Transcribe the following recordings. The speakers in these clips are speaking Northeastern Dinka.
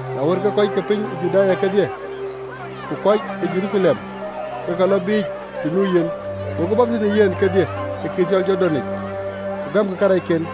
Na wën, ke kɔc ke piny ë Juda kedhie, ku kɔc ke Jeruthalem, ke ke lɔ biic të nu yen, go ke baptith në yen kedhie ë wɛ̈ɛ̈r de Jordan yic, ku gamkï karɛcken.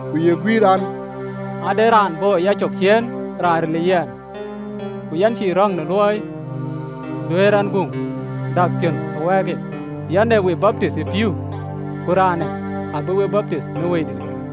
Ku ye guiir an, “Ade raan bɔ̈ ë yacök ciëën, raan ril ë yɛn, ku yɛn cï röŋ në luɔi duɛ̈ɛ̈r ɛn guŋ dak thiönh ë wɛɛrke. Yɛn ë we baptith ë pïïu: ku raanë abï we baptith në Wëidït ɣer.”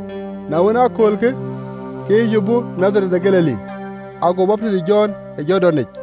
Na wën, ë aköölkë, ke Yecu bɔ̈ Nadhareth de Galili, ago baptith ë Jɔn ë Jordanic.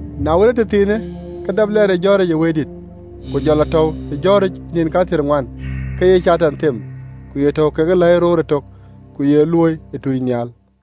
Na wën, ë tëthiinë, ke dap lɛɛr ë jɔ̈ɔ̈ric ë Wëidït. Ku jɔ lɔ tɔ̈u ë jɔ̈ɔ̈ric ë nïn kathiërŋuan, ke ye Catan them, ku ye tɔ̈u kekë läi roor ëtök, ku ye luööi ë tuucnhial.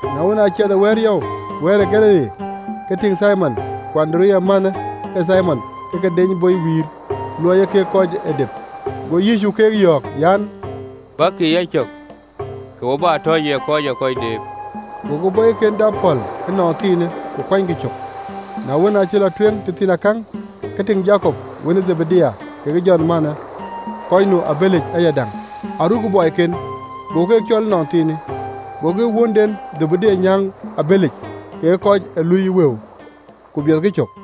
Na wën, aa ciɛth ë Baar ë Galili yɔu, ke tïŋ Thimon ku Andereya mänhë ë Thimon ke ke deeny bɔi wïïr: luɔi ee kek kɔc ee dep. Go Yecu keek yɔ̈ɔ̈k an, “Bäkï ë yacök, ke we bä tɔ ye kɔc ë kɔc deep.” Gokï bɔɔiken dap pɔ̈l ënɔnthiinë, ku kuanykï cök. Na wën, acï lɔ tueŋ tëthiinakäŋ, ke tïŋ Jakop wën ë Dhebedayo kekë Jɔn mänhë, kɔc nu ë abëlic ayadäŋ, arukkï bɔɔiken. Go keek cɔɔl ënɔnthiinë: gokï wuönden Dhebedayo nyääŋ ë abëlic kekë kɔc ë luui ë wëu, ku biɔthkï cök.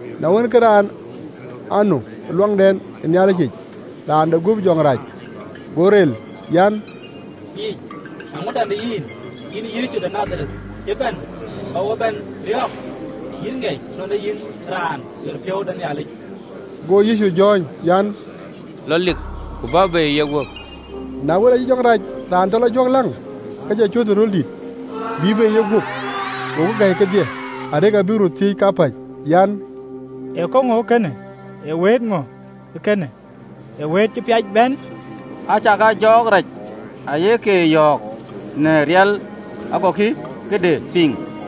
Na wën, ke raan anu ë ɣöndɛn ë Nhialic yic raan de guöp jɔŋ rac, go rel an, “Yecu! Eeŋöda në yïn, yïn Yecu de Nadhareth? Cï bɛ̈n bä wo bɛ̈n riɔ̈ɔ̈k? Yïn ŋiɛc nɔn ee yïn Raan ɣeric de Nhialic!” Go Yecu jɔ̈ɔ̈ny an, “Lɔ lik, ku bä bei ë yeguöp!” Na wën, aacï jɔŋ rac raan tɔ lɔ juɔ̈kläŋ, ke jɔ cööt ë röl dït, ku bïï bei ë yeguöp. Gokï gäi kedhie, arëk abïk röt thiëëc kapäc an, “Ee käŋö ee kënë? Ee wëët ŋö ee kënë wëët cï piac bɛ̈në? Acakaa jɔɔk rac aye ke yɔ̈ɔ̈k në riɛl, agokï këde piŋ!”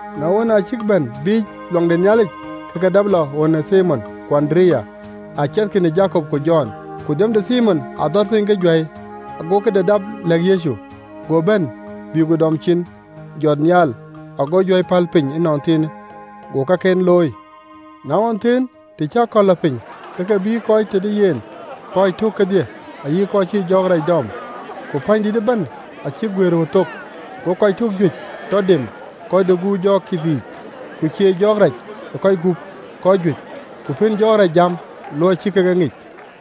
Na wën, aa cïk bɛ̈n biic ɣön ë Nhialic, ke ke dap lɔ ɣön ë Thimon ku Andereya, aciɛthkï në Jakop ku Jɔn. Ku dhiɔm de Thimon adhɔt piny ke juäi, agokï këde dap lɛ̈k Yecu. Go bɛ̈n, bïï ku dɔm cin, jɔt nhial, go juäi päl piny ënɔnthiinë, go kaken looi. Na ɣɔn thëën, të cï akɔ̈l lɔ piny, ke ke bïï kɔc tëde yen kɔc tök kedhie ayï kɔc cïï jɔɔk rac dɔm. Ku kɔc ke pänydït ëbɛ̈n acïk guëër ɣöt thok. Go kɔc tök juëc tɔ dem kɔc de gup jɔɔk kith yiic, ku cieec jɔɔk rac ë kɔc gup kɔc juëc, ku pën jɔɔk rac jam, luɔi cï kek e ŋic.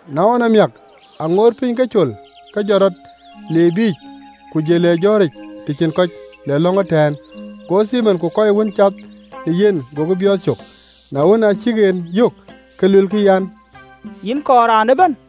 Na ɣɔn amiäk, aŋoot piny ke col, ke jɔt rɔt, le biic, ku jël le jɔ̈ɔ̈ric të cïn kɔc, le lɔ̈ŋ ëtɛ̈ɛ̈n. Go Thimon ku kɔc wën cath në yen gokï biɔɔth cök, na wën, aa cïk en yök, ke luelkï an, “Yïn kɔɔr raan ëbɛ̈n.”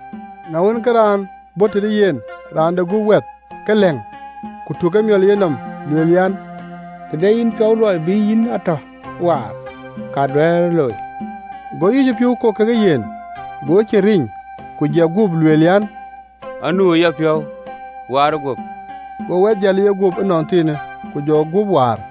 Na wën, ke raan bɔ̈ tëde yen, raan de guöp wɛth ke läŋ, ku tuk emiɔl ë yenɔm, lueel an, “Të de yïn piɔ̈u luɔi bï yïn a tɔ waar, ka duëërë looi.” Go Yecu piɔ̈u kok ke yen, go ecin riny, ku jɛk guöp, lueel an, “Anu ë yapiɔ̈u, waar guöp.” Go wɛth jäl ë yeguöp ënɔnthiinë, ku jɔ guöp waar.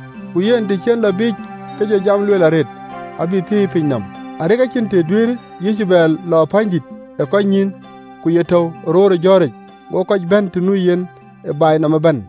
Ku yen, të cï en lɔ biic, ke jɔ jam lueel arëët, abï thiëi ë piny nɔm, arëk acïn të duëërë Yecu bɛ lɔ pänydït ë kɔc nyïïn, ku ye tɔ̈u röör ë jɔ̈ɔ̈ric: go kɔc bɛ̈n të nu yen ë baai yic ëbɛ̈n.